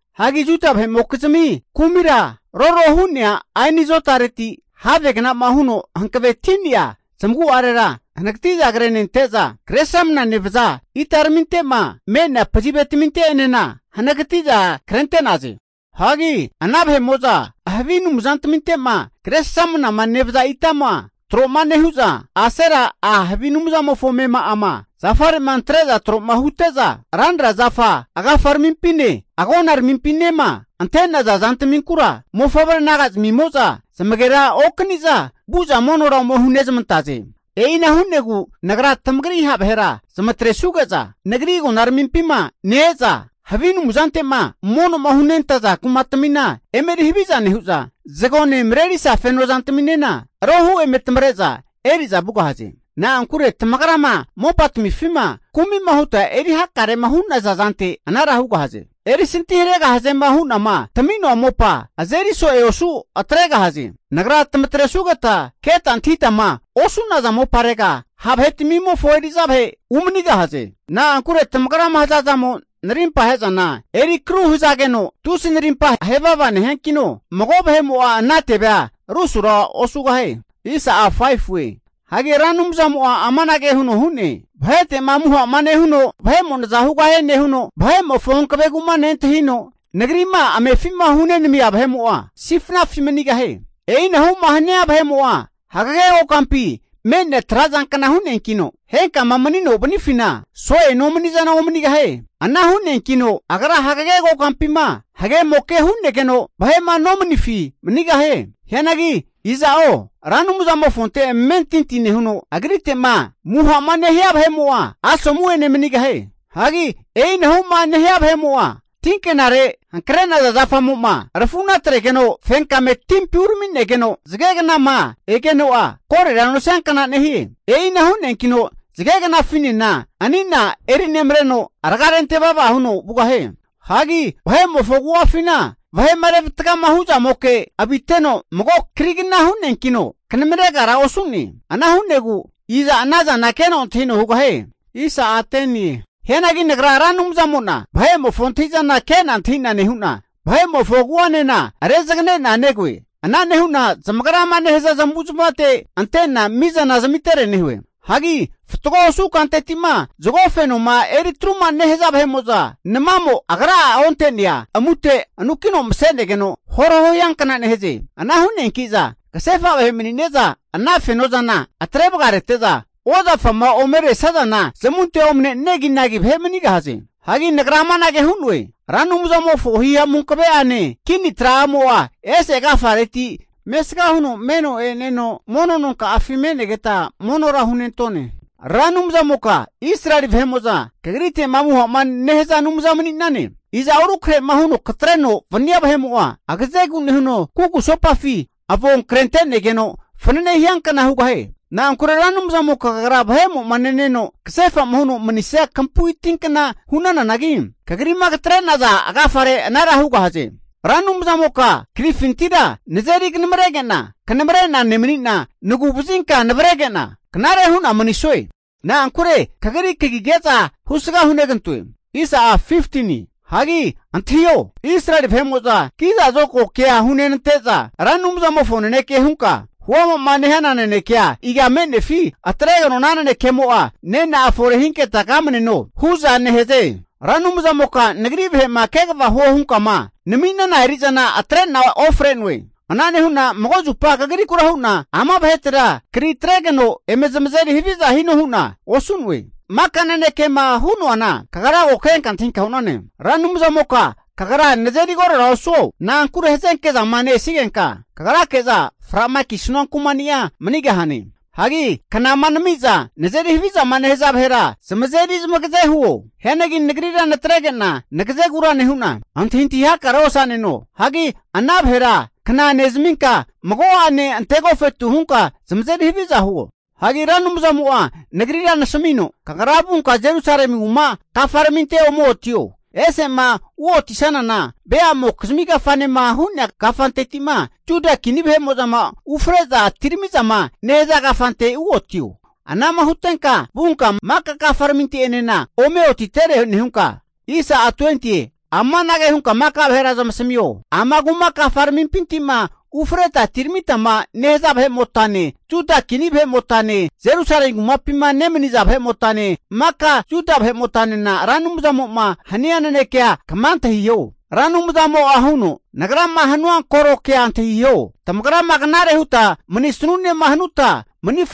Hagi Juda vahe'mokizmi kumira roro hu'nea aini zotareti havegna'ma huno hankaveti'nea zamagu'arera hanagati'za krenente'za, Kresramanama nevaza itaraminte'ma me'nea pazivetaminte'enena hanagati'za krente'naze. Hagi ana vahe'mo'za havi anumzantaminte'ma Kresramanama nevaza itama tro nehu'za, Asera a' havi anumzamofo amema'ama zafare'ma antre'za tro'ma hute'za, ranra zafa agafaramimpine agonaramimpinema ante'naza zantaminkura mofavre naga'zmimo'za zamagera okani'za vu'za monora ome hunezmantaze. E'ina hu'negu Nagra tamagri ha' vahera zamatresuge'za Nagri agonaramimpina ne-eza havi anumzante'ma mono'ma hunentaza kumatamina eme eri haviza nehu'za, zagone marerisa feno zantaminena rohu eme tamare'za eri'za vugahaze. Na'ankure tamagrama mopatamifima kumi'ma huta eri hakarema hu'naza zante anara hugahaze. Erisanti haregahazema hu'nama tami'noa mopa azeri so'e osu atregahaze. Nagra tamatresugeta keta antahitama osu'naza moparega ha' vahetamimofo eri'za vahe umanigahaze. Na'ankure tamagrama hazazamo narimpa ahe'zana eri akru hazageno, tusi narimpa ahe vava nehiankino, mago vahe'mo'a ana tevea rusura osugahie. Hagi Ra Anumzamo'a amanage huno hu'ne, Vahete'ma amuha'ma nehuno vahe'mo naza hugahie nehuno, vahe'mofo hankavegu'ma nentahino, Nagri'ma amefi'ma hunenamia vahe'mo'a sifnafi manigahie. E'inahu'ma hania vahe'mo'a hagege kokampi me'nea trazankna hu'neankino, henkama manino vanifina so'e nomani'zana omanigahie. Ana hu'neankino agra hagege kokampima hagemoke hu'negeno vahe'ma nomanifi manigahie. Hianagi iza'o Ra Anumzamofonte amentinti nehuno, Agritema amuha'ma nehania vahe'mo'a asomu'ene manigahie. Hagi e'inahuma nehia vahe'mo'a, tinke'nare hankre'naza zafamo'ma rafu'na atregeno fenkame timpi urami'negeno, zagegnama egeno'a korera nosiankna nehie. E'ina hu'neankino zage knafinena ani'na eri nemareno raga rente vava huno vugahie. Hagi vahe'mofo agu'afina vahe'ma revatagama hu'zamoke aviteno mago krigna hu'neankino kanamaregara osu'ne. Ana hu'negu iza ana zana keno antahino hugahie? Hianagi Nagra Ra Anumzamo'na vahe'mofo antahi'zana ke'na antahi'na nehu'na, vahe'mofo agu'anena rezagane'na negoe. Ana nehu'na zamagrama nehaza zamavu zamavate ante'na mizana zamitere nehue. Hagi fatgo osu kanteti'ma zago fenoma eri atruma nehaza vahe'mo'za, namamo agra'a onte'nea amute anukino mase'negeno horaho hiankna nehaze. Ana hu'neanki'za kasefa vahe mani'neza ana feno zana atre vagarete'za, ozafama ome resazana zamunte omane negi nagi vahe manigahaze. Hagi nagra amanage hu'noe, Ra Anumzamofo hihamu hankave'ane kini tra'mo'a ese agafareti mesga huno meno e'neno, mono noma'afi me'negeta monora hunentone. Ra Anumzamoka Israeli vahe'mo'za Kagrite'ma amuha'ma nehaza Anumza mani'nane. Iza'o rukrahe'ma huno katreno vania vahe'mo'a agazegu nehuno kugusopafi avon krente'negeno fanene hiankna hugahie. Na'ankure Ra Anumzamoka kagra vahemo'ma neneno kasefa'ma huno manisia kampui tinkna hu'nananagi, kagri'ma katre'naza agafare anara hugahaze. Ra Anumzamoka krifintira nazeri kanamarege'na kanamare'na nemani'na, nagu'vazinka navarege'na knare hu'na manisue. Na'ankure kagri kagige'za husga hunegantoe. Hagi antahio, Israeli vahe'mo'za kiza zokago kea hunenante'za, Ra Anumzamofo naneke hunka huama'ma nehana nanekea, iga me'nefi atregeno ana nanekemo'a nena'a efore hinketa kamneno? hu'za nehaze. Ra Anumzamoka nagri vahe'ma kegava huo hunka'ma nami'nana eri'zana atrena ofre'noe. Ana nehu'na mago zupa kagrikura hu'na, ama vahetera kari atregeno eme zamazeri haviza hino hu'na osu'noe. Maka nanekema hu'noana kagra ko kenka antahinka hu'nane. Ra Anumzamoka kagra nazeri korora osuo. Na'ankure hazenke zama ne-esigenka kagrake'za fra'ma kisanua kumani'a manigahane. Hagi knama nami'za nazeri havizama nehaza vahera zamazeri zamagaze huo. Hianagi nagrira natrege'na nagazegura nehu'na, antahintahi hakarea osa'neno. Hagi ana vahera kna nezaminka mago'ane ante agofetu hunka zamazeri haviza huo. Hagi Ra Anumzamo'a nagrira nasamino, Kagra vunka Jerusalemi kuma kafaraminte ome otio. Ese'ma uotisanana veamokizmi kafanema hu'nea kafanteti'ma, Juda kini vahe'mo'zama ufre'za atirami'zama nehaza kafante uotio. Ana'ma hutenka vunka maka kafaraminte'enena ome otitere nehunka, amanage hunka maka vahera zamasamio. Ama kuma kafaramimpinti'ma ufreta atiramitama nehaza vahe'motane, Juda kini vahe'motane Jerusalemi kumapima nemaniza vahe'motane, maka Juda vahe'motanena Ra Anumzamo'ma hania nanekea kama antahiho. Ra Anumzamo'a huno, Nagrama hanua koro kea antahiho. Tamagrama knare huta mani'sanunema hanuta, mani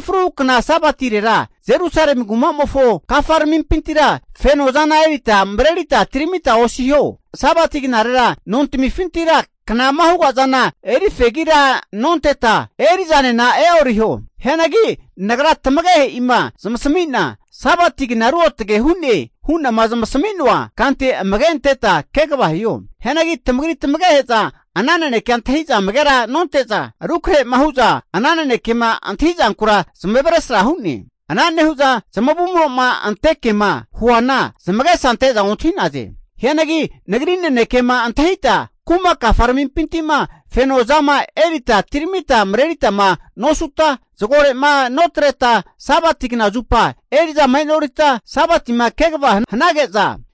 fruhu kna Sabatirera Jerusalemi kumamofo kafaramimpintira feno zana erita marerita atiramita osiho. Sabati knarera nontamifintira knama huga zana eri fegira nonteta, eri'zanena e'oriho. Hianagi Nagra tamagehe'ima zamasami'na Sabati kna ruotge hu'ne hu'nama zamasami'noa kante amage anteta kegava hiho. Hianagi tamagri tamagehe'za ana nanekea antahi'za amagera nonte'za rukrahema hu'za ana nanekema antahi zankura zamavaresra hu'ne. Ana nehu'za zamavumro'ma ante kema huana zamagesa ante'za ontahi'naze. Hianagi Nagri nanekema antahita, kuma kafaramimpinti'ma feno zama erita atiramita mareritama nosuta, zagore'ma notreta, Sabati kna zupa eri'zama e'norita, Sabatima kegavama hanage'za,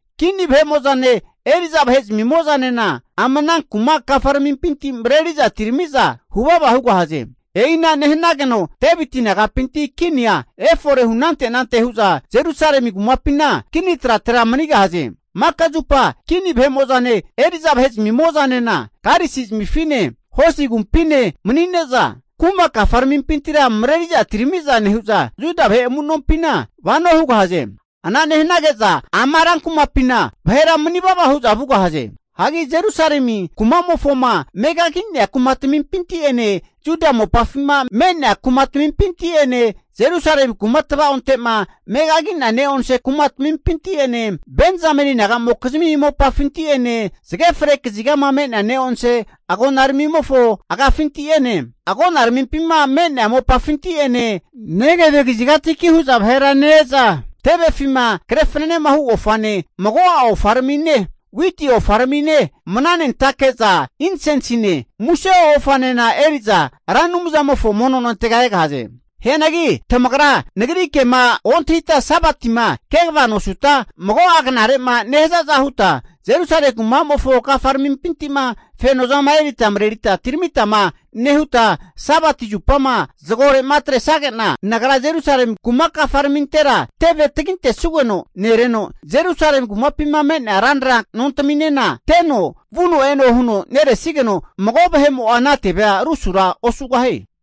kini vahemo'zane eri'za vahe zamimo'zanena ama ana kuma kafaramimpinti mareri'za atirami'za huvava hugahaze. E'ina nehanigeno Deviti nagapinti kinia efore hunante anante hu'za Jerusalemi kumapina kini tratera manigahaze. Maka zupa kini vahemo'zane eri'za vahe'zamimo'zanena, karisizamifine hosi agumpine mani'neza, kuma kafaramimpintira mareri'za atirami'za nehu'za, Juda vahe amu'nompina vano hugahaze. Ana nehanage'za ama rankumapina vahera manivava hu'za vugahaze. Hagi Jerusalemi kuma'mofoma megagi'nea kumatamimpinti'ene Juda mopafima me'nea kumatamimpinti'ene, Jerusalemi kuma tavaonte'ma megagi'nea ne'onse kumatamimpinti'ene, Benzameni naga'mokizmi mopafinti'ene, zage fre kazigama me'nea ne'onse agonaramimofo agafinti'ene, agonaramimpima me'nea mopafinti'ene, Negevi kazigatiki hu'za vahera ne-e'za, tevefima kre fananehu ofane, mago'a ofaramine, witi ofaramine, mana nentake'za insensine, muse ofanena eri'za Ra Anumzamofo mono nontega egahaze. Hianagi tamagra Nagri kema ontahita Sabatima kegavama nosuta, mago'a knare'ma nehazaza huta, Jerusalemi kumamofo kafaramimpinti'ma fenozama erita marerita atiramita nehuta Sabati zupama ke'onke zama zagore'ma atresage'na, Nagra Jerusalemi kuma kafaramintera teve tagintesanugeno nereno, Jerusalemi kumapima me'nea ranra nontaminena teno vuno eno huno neresigeno, mago vahe'mo'a ana tevea rusura osugahie.